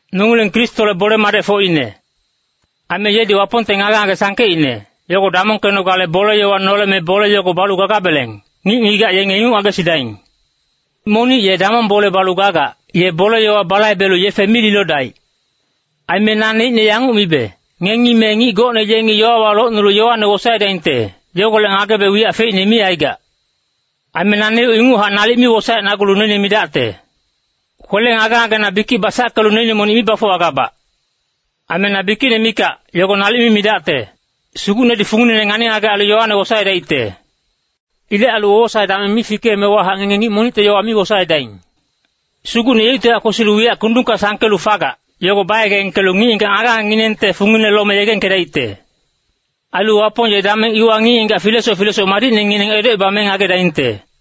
Nongileng Kristole bole-madecfocine. Aime yedi Wapongte ngage-ngage sangkeicne, yogo damongkenogale bole-yowa noleme bole yogo balu gagabeleng, ngic-ngigac yenge inguc ngagesidaing. Monic ye damong bole balu gagac, ye bole-yowa balaibelu yefe mi lilodaic. Aime naneicne yanguc mibe, ngengi me ngic gocne yengi yowawa locnulu yowane wosaedaingte, yogolec ngagebe wiyac feicne mi aigac. Aime naneuc inguchac nalic mi wosaecnagulu noine midacte. Kwele ngage-ngagena bikic basackelu noine monic mi bafuwagabac. Aime na bikicne mikac, yogo nalic mi midacte. Sugucnedi funginene ngani-ngagec ailu yowane wosaedaicte. Ilec ailu wowosae dameng mi fikeemewahac ngenge ngic monicte yowa mi wosaedaing. Sugucne yeuctihac kwesilu wiyac kundungka sangkelu fagac, yogo bayegengkelu ngic-ngigac ngage-ngagenginengte fungine lome yegengkedaicte. Ailu Wapong ye dameng iwa ngic-ngigac filesoc filesoc madicnengineng edocebame ngagedaingte.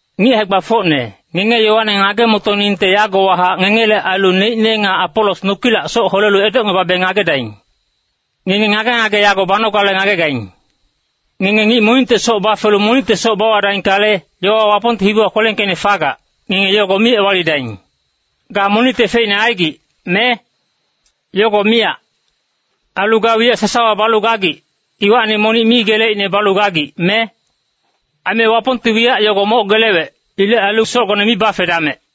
Ngic hae-gbafocne, ngenge yowane ngage-motoningte yagowahac ngengele ailu neicne nga Apolos nokilac soc holelu edocngebabe ngagedaing. Ngenge ngage-ngage yago banogale ngagegaing. Ngenge ngic monicte soc bafelu monicte soc bawadaingkale, yowa Wapongte hibiwa kwelengkeicne fagac, ngenge yogo mi ewalidaing. Ga monicte feicne aigic, me? Yogo miyac. Ailu ga wiyac sasawa balu gagic, iwacni monic mi geleicne balu gagic, me? Aime Wapongti wiyac yogo moc gelewec. Ilec ailu socgone mi bafedamec.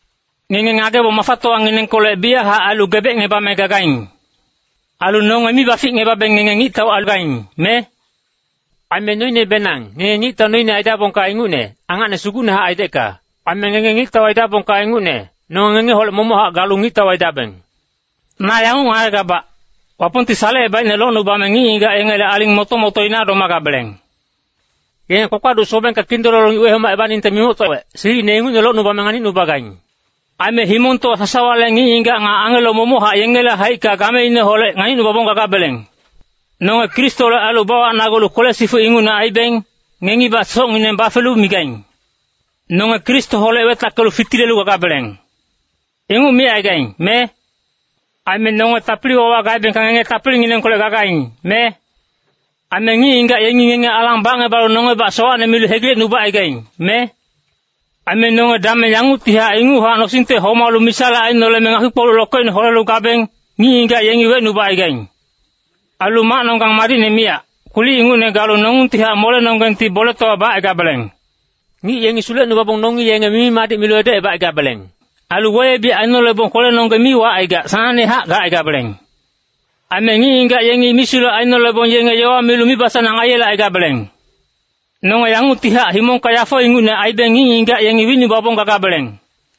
Ngenge ngagebong mafatowanginengkolec biyachac ailu gebecngebame gagaing. Ailu nonge mi baficngebabeng ngenge ngictau aigaing, me? Aime noinebenang, ngenge ngictau noine aidabongka ingucne, angacne sugucnehac aidecka. Aime ngenge ngictau aidabongka ingucne, nonge ngengeholec momochac galu ngictau aidabeng. Na yanguc ngagegabac, Wapongti salecebaicne locnubame ngic-ngigac yengele aling moto-motoina domagabeleng. Yenge kpakpaduc sobengka kindololo ngic wehomacebaningte mimoctowec, silicine ingucne locnubame nganicnubagaing. Aime himongtowa sasawale ngic-ngigac nga angelo momochac yengele haicka gameineholec nganicnubabong gagabeleng. Nonge Kristole ailu bawacnagulu kwele-sifuc ingucne aibeng, ngengibac socngineng bafelu migaing, “Nonge Kristoholec wetackelu fitilelu gagabeleng.” Inguc micaigaing, me? Aime nonge tapili-wawa gaebengka ngenge tapilinginengkolec gagaing, me? Aime ngic-ngigac yengi ngenge alang bacngebalu nongebac sowacne milu hegilecnubacaigaing, me? Aime nonge dameng yanguctihac inguchac nosingte homalu misale ainoleme ngakpi-kpoluc lokeicne holelu gabeng, ngic-ngigac yengi wecnubacaigaing. Ailu macnonggeng madicne miyac, kwilic ingucne galu nongungtihac molenonggengti boletowa bacaigabeleng. Ngic yengi sulecnubabong nongi yenge mimi-madic milu edocebacaigabeleng. Ailu weyebic ainolebong kwelenonggeng mi wacaigac, sanangnehac gacaigabeleng. Aime ngic-ngigac yengi misulec ainolebong yenge yowa milu mibasanang aiyelecaigabeleng. Nonge yanguctihac himongka yafo ingucne aibeng ngic-ngigac yengi wicnubabong gagabeleng.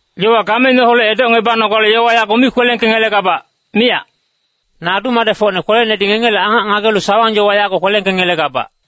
Yowa gameineholec edocngebanogale yowa yago mi kwelengkengelegabac, miyac. Na adu-madecfocne kwelenedi ngengele angac ngagelu sawang-yowa yago kwelengkengelegabac.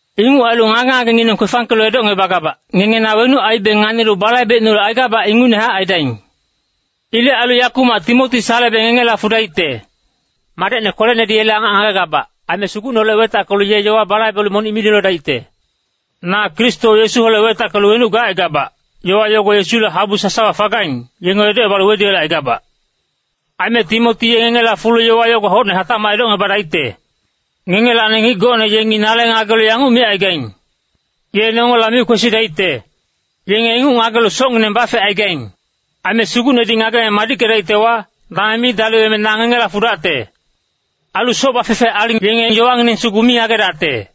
Inguc ailu ngage-ngagengineng kwefangkelu edocngebagabac, ngenge na wenuc aibe nganilu balaibecnulu aigabac ingucnehac aidaing. Ilec ailu yakumac Timoti salebe ngengela fudaicte. Madecne kwelenedi yele angac ngagegabac, aime Sugucneholec wetackelu ye yowa balaibelu monic mi lilodaicte. Na Kristo Yesuholec wetackelu wenuc gacaigabac, yowa yogo Yesule habu sasawa fagaing, yenge edocebalu weduyelecaigabac. Aime Timoti ye ngengela fulu yowa yogo hocne hatacmac edocngebadaicte. Ngengelacni ngic gocne yengi nale ngagelu yanguc micaigaing, “Ye nongela mi kwesidaicte.” Yenge inguc ngagelu socngineng bafecaigaing. Aime Sugucnedi ngageme madickedaictewa, dameng mi daliweme na ngengela fudacte. Ailu soc bafefe aling yenge yowangineng sugu mi ngagedacte.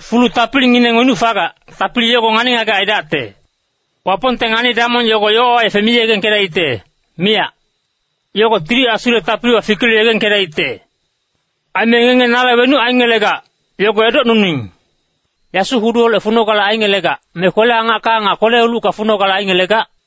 Fulu tapilingineng wenuc fagac, tapili yogo ngani-ngagec aidacte. Wapongte ngani-damong yogo yowawa yefe mi yegengkedaicte, miyac. Yogo Tili Asule tapiliwa fikelu yegengkedaicte. Aime ngenge nale wenuc aingelegac, yogo edocnuning. Yasu-huduholec funogale aingelegac, me kwele-angacka nga kwele-ulucka funogale aingelegac?